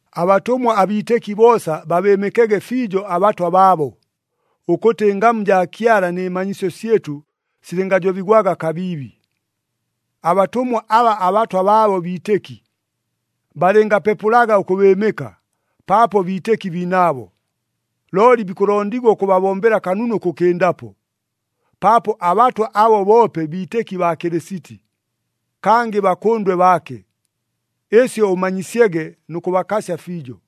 Abatʉmwa abiitɨki boosa babɨɨmɨkege fiijo abatwa baabo, ʉkʉtɨ ɨngamu jaa Kyala nɨ manyisyo syɨtʉ silɨngajobigwaga kabiibi. Abatʉmwa aba abatwa baabo biitɨki, balɨngapepʉlaga ʉkʉbɨɨmɨka, paapo biitɨki biinaabo. Looli bikʉlondigwa ʉkʉbabombela kanunu ʉkʉkɨndapo, paapo abatwa abo boope biitɨki baa Kɨlɨsiti, kangɨ bakʉndwe baake. Ɨsyo ʉmanyisyege nʉ kʉbakasya fiijo.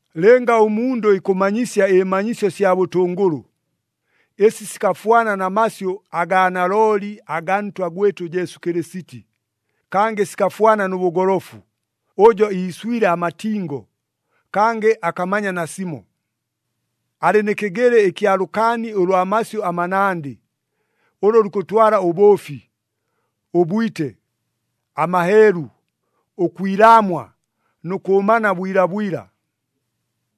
Lɨnga ʉmundʉ ikʉmanyisya ɨmanyisyo sya bʉtʉngʉlʉ, ɨsi sikafwana na masyʉ agaa nalooli agaa Ntwa gwɨtʉ Jesu Kɨlɨsiti, kangɨ sikafwana nʉ bʉgolofu, ʉjo iiswile amatingo, kangɨ akamanya nasimo. Alɨ nɨ kɨgɨlɨ ɨkya lʉkaani ʉlwa masyʉ amanandɨ, ʉlʉ lukʉtwala ʉbʉʉfi, ʉbwite, amaheelu, ʉkwilaamwa nʉ kʉʉmana bwilabwila.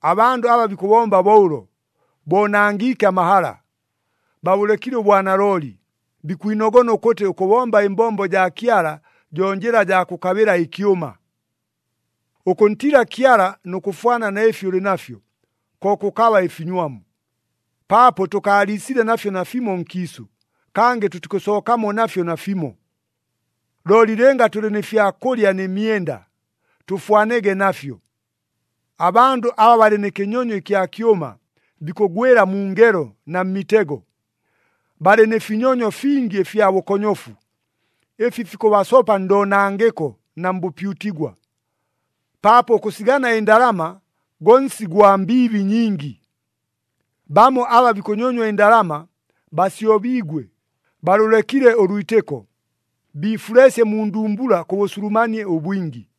Abandʉ aba bikʉbomba bo ʉlo, boonangiike amahala, babʉlekile ʉbwanalooli, bikwinogona ʉkʉtɨ ʉkʉbomba ɨmbombo jaa Kyala jo njɨla jaa kʉkabɨla ɨkyʉma. Ʉkʉntiila Kyala nʉ kʉfwana na ɨfi ʉlɨ nafyo, ko kʉkaba ɨfinywamu. Paapo tʉkaaliisile nafyo nafimo nkiisʉ, kangɨ tʉtikʉsookamo nafyo nafimo. Looli lɨnga tʉlɨ nɨ fya kʉlya nɨ myenda, tʉfwanege nafyo. Abandʉ aba balɨ nɨ kɨnyonyo ɨkya kyʉma, bikʉgwɨla mu ngelo na mmitego. Balɨ nɨ finyonyo fingi ɨfya bʉkonyofu, ɨfi fikʉbasopa ndoonangɨko na mbʉpyutigwa. Paapo ʉkʉsigana ɨndalama go nsi gwa mbiibi nyingi. Bamo aba bikʉnyonywa ɨndalama, basyobiigwe, balʉlekile ʉlwitɨko, biifuleesye mu ndumbula kʉ bʉsulumanie ʉbwingi.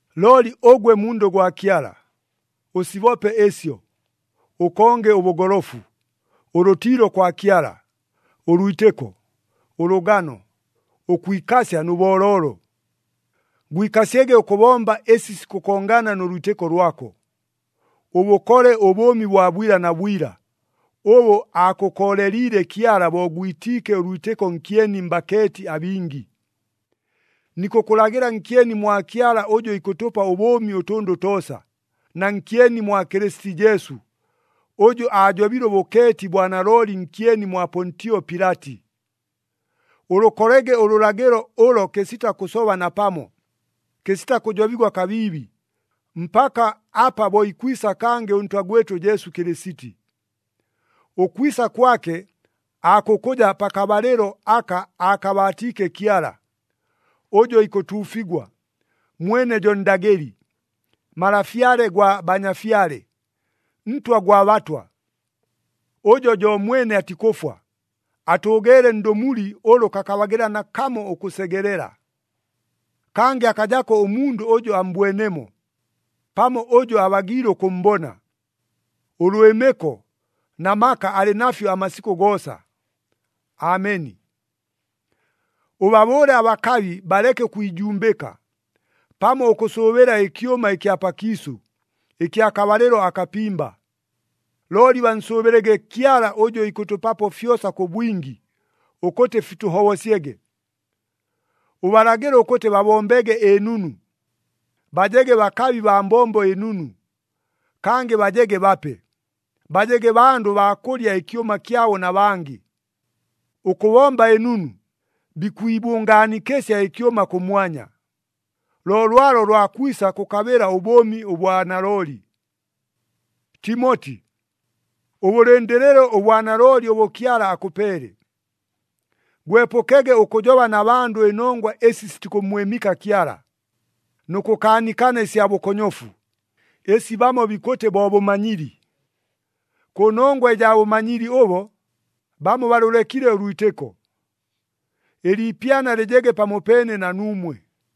Looli ʉgwe mundʉ gwa Kyala, ʉsibope ɨsyo. Ʉkonge ʉbʉgolofu, ʉlʉtiilo kwa Kyala, ʉlwitɨko, ʉlʉgano, ʉkwikasya nʉ booloolo. Gwikasyege ʉkʉbomba ɨsi sikʉkongana nʉ lwitɨko lwako. Ʉbʉkole ʉbʉʉmi bwa bwila na bwila, ʉbʉ aakʉkooleliile Kyala bo gwitiike ʉlwitɨko nkyeni mbakeeti abingi. Nikʉkʉlagɨla nkyeni mwa Kyala ʉjʉ ikʉtʉpa ʉbʉʉmi ʉtʉndʉ toosa, na nkyeni mwa Kɨlɨsiti Jesu, ʉjʉ aajobile ʉbʉkeeti bwa nalooli nkyeni mwa Pontio Pilati. Ʉlʉkolege ʉlʉlagɨlo ʉlo kɨsita kʉsoba napamo, kɨsita kʉjobigwa kabiibi, mpaka apa bo ikwisa kangɨ ʉNtwa gwɨtʉ Jesu Kɨlɨsiti. Ʉkwisa kwake aakʉkʉja pakabalɨlo aka akabaatiike Kyala, ʉjʉ ikʉtuufigwa, mwene jo Ndagɨli, Malafyale gwa banyafyale, Ntwa gwa batwa. Ʉjo jo mwene atikʉfwa, atʉʉgeele ndʉmuli ʉlʉ kakabagɨla nakamo ʉkʉsegelela. Kangɨ akajako ʉmundʉ ʉjʉ ammbwenemo, pamo ʉjʉ abagiile ʉkʉmmbona. Ʉlwɨmɨko na maka alɨ nafyo amasikʉ goosa. Ameni. Ʉbabʉʉle abakabi baleke ʉkwijumbɨka, pamo ʉkʉsʉʉbɨla ɨkyʉma ɨkya pakiisʉ, ɨkya kabalɨlo akapimba. Looli bansʉʉbɨlege Kyala ʉjʉ ikʉtʉpapo fyosa kʉ bwingi, ʉkʉtɨ fitʉhobosyege. Ʉbalagɨle ʉkʉtɨ babombege ɨnunu, bajege bakabi baa mbombo ɨnunu, kangɨ bajege bape. Bajege bandʉ baa kʉlya ɨkyʉma kyabo na bangɨ. Ʉkʉbomba ɨnunu, bikwibʉngaanikɨsya ɨkyʉma kʉmwanya, lo lwalo lwa kwisa kʉkabɨla ʉbʉʉmi ʉbwa nalooli. Timoti, ʉbʉlɨndɨlɨle ʉbwanalooli ʉbʉ Kyala akʉpeele. Gwepʉkege ʉkʉjoba na bandʉ ɨnongwa ɨsi sitikʉmmwɨmɨka Kyala, nʉ kʉkaanikana ɨsya bʉkonyofu, ɨsi bamo bikʉtɨ bo bʉmanyili. Kʉnongwa ɨjaa bʉmanyili ʉbo, bamo balʉlekile ʉlwitɨko. Ɨliipyana lɨjege pamopeene na nuumwe.